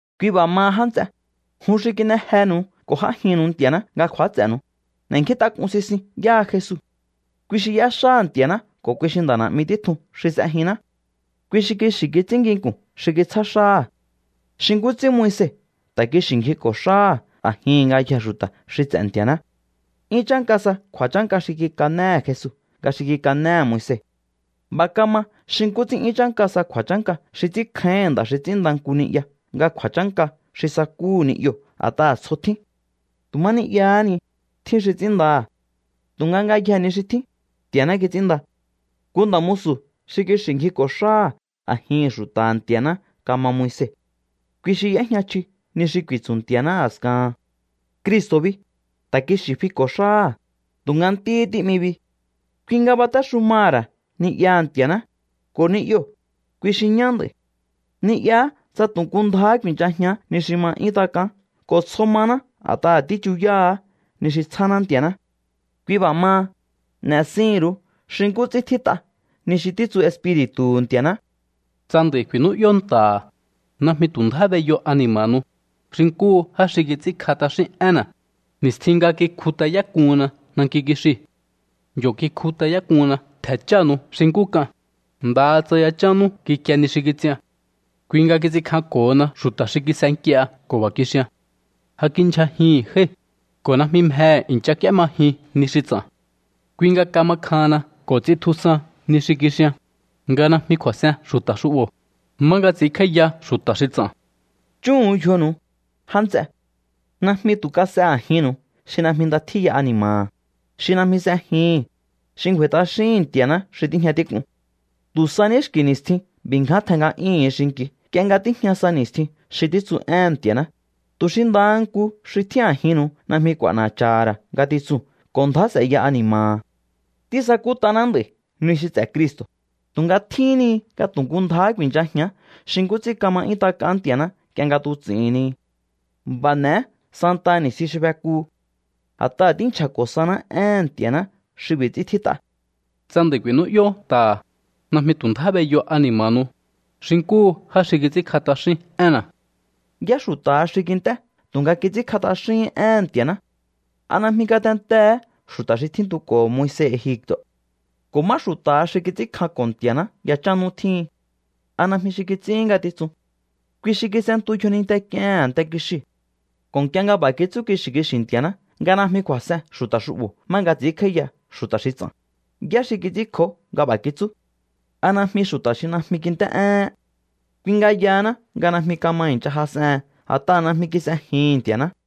Kui b'a̱ maha, já nts'e, jun xi kin'e jenu̱u ko̱ j'ájinnu̱u Nti̱a̱ná nga kju̱áts'e̱nu̱u, n'e̱nkjíntak'un sisiun yáha Jesu. Kui xi y'éxáha̱ Nti̱a̱ná ko̱ kui xi nda̱ na̱'mi títjun xi s'ejinná. Kui xi kixi̱ kits'ín nginku̱n xi kitsjá xáha̱, xi nkú ts'ín Moise ta̱ kixi̱ ngjiko̱ xáha̱ a̱jihi̱n ngayjee̱ xu̱ta̱ xi ts'e̱ Nti̱a̱ná. 'Yún chánka sa kju̱a̱chánka xi kikanéhe̱ Jesu nga xi kikanéhe̱ Moise. B'a̱ kama xi nkú ts'ín 'yún chánka sa kju̱a̱chánka xi ts'ínkjáíhi̱n nda̱ xi ts'ínnda nku ni'ya nga kju̱a̱chánka xi sakúhu̱ ni'yoo̱ a̱t'aha̱ tsjo tjín. Tu̱ má ni'yahá ni, tjín xi ts'ínndaha̱. Tu̱nga ngayjee̱ ni xi tjín, Nti̱a̱ná kits'ínnda. Nku nda̱ musu̱ xi kixi̱ ngjiko̱ xáha̱ a̱jihi̱n xu̱ta̱ha̱ Nti̱a̱ná kama Moise. Kui xi y'éjña chji ni xi ku̱i̱tsu̱ Nti̱a̱ná a̱skahan. Cristo̱ bi, ta̱ kixi̱ fiko̱ xáha̱, tu̱nga Ntíhí tí'mi bi. Kui nga batéxumaha̱ ra̱ ni'yaha̱ Nti̱a̱ná. Ko̱ ni'yoo̱, kui xi ñá nd'a̱i̱. Ni'yaá tsa tu̱ nku ndjáhá ku̱i̱nchajián ni xi ma 'yún tak'aán ko̱ tsjo maná a̱t'aha̱ tíchuyáha̱á ni xi tsjáná Nti̱a̱ná. Kui b'a̱ maha, n'e̱sihi̱n ru̱u xi nkú ts'ín tjít'a ni xi títsu Espiri̱tu̱hu̱ Nti̱a̱ná: Tsa nd'a̱i̱ ku̱i̱nú'yó nta̱ha̱, najmi tu̱ ndjá b'eyo ani̱ma̱nu̱u, xi nkúhu já xi kits'ínkj'a t'axín énna̱, ni̱stjin nga kikjut'ayák'unna nanki kixiu̱. Yo̱ kikjut'ayák'unna ntje̱ chánu̱u xi nkú k'an, ndaha tsa yachán nú kikie ni xi kits'ian. Kui nga kits'inkjanko̱hona xu̱ta̱ xi kis'e nk'ie ko̱ b'a̱ kixian: “Ja kindyjajihi̱n jái̱, ko̱ najmi mjehe̱ i̱ncha k'úémajin ni xi ts'a̱n.” Kui nga kama kjahanna ko̱ ts'intjusan ni xi kixian, nga najmi kju̱a̱s'en xu̱ta̱ xu'bo̱, má nga ts'i̱ínkj'áíya xu̱ta̱ xi ts'a̱n. Chúhu̱un yjonu̱u, já nts'e. Najmi tu̱ kas'e a̱jinnu̱u xi najmi nda tjíya ani̱ma̱ha̱, xi najmi s'ejihi̱n, xi ngju̱a̱i̱ t'axíhi̱n Nti̱a̱ná xi tíjña tík'un. Tu̱ sa ní xki̱ ni̱stjin b'i̱ ngján tjen nga'yúhu̱un xinki̱u nk'ie nga tíjña sa ni̱stjin xi títsu éhe̱n Nti̱a̱ná, tu̱ xi ndaha nku xi tjín a̱jinnu̱u najmi k'u̱a̱na̱cha̱ha̱ ra̱ ngatitsuu̱n ko̱ ndjá s'e̱ya ani̱ma̱ha̱. Tísakút'aná nd'a̱i̱ ni xi ts'e̱ Cristo̱, tu̱nga tjíhín ni nga tu̱ nku ndjáhá ku̱i̱nchajián xi nkú ts'ín kama 'yún tak'aán Nti̱a̱ná nk'ie nga tuts'ihi̱n ni. B'a̱ n'e̱é santaha ni̱stjin xi fekuhu. A̱t'aha̱ tínchja̱ko̱ saná éhe̱n Nti̱a̱ná xi b'i̱ ts'ín tjít'a: Tsa nd'a̱i̱ ku̱i̱nú'yó nta̱ha̱, najmi tu̱ ndjá b'eyo ani̱ma̱nu̱u, xi nkúhu já xi kits'ínkj'a t'axín énna̱. ¿Yá xu̱ta̱ha xi kint'é tu̱nga kits'ínkj'a t'axíhín éhe̱n Nti̱a̱ná? ¿A najmi ngatentee̱hé xu̱ta̱ xi tsitjuko̱ Moise Egipto̱? ¿Ko̱ má xu̱ta̱ha xi kits'ínkjanko̱ Nti̱a̱ná yachán nú tjíhin? ¿A najmi xi kits'íhín ngatitsun? Kui xi kis'entu yjoninte k'iehe̱n a̱nte kixiu̱. Ko̱ nk'ie nga b'a̱ kitsú kixi̱ kixi̱ Nti̱a̱ná nga: “Najmi kju̱a̱s'en xu̱ta̱ xu'bo̱ má nga ts'ínkj'áíya xu̱ta̱ xi ts'a̱n”, ¿yá xi kits'ínkjó nga b'a̱ kitsú? ¿A najmi xu̱ta̱ xi najmi kint'é'éhén? Kui nga yahaná nga najmi kama i̱ncha jas'ehen a̱t'aha̱ najmi kis'ejihi̱n Nti̱a̱ná.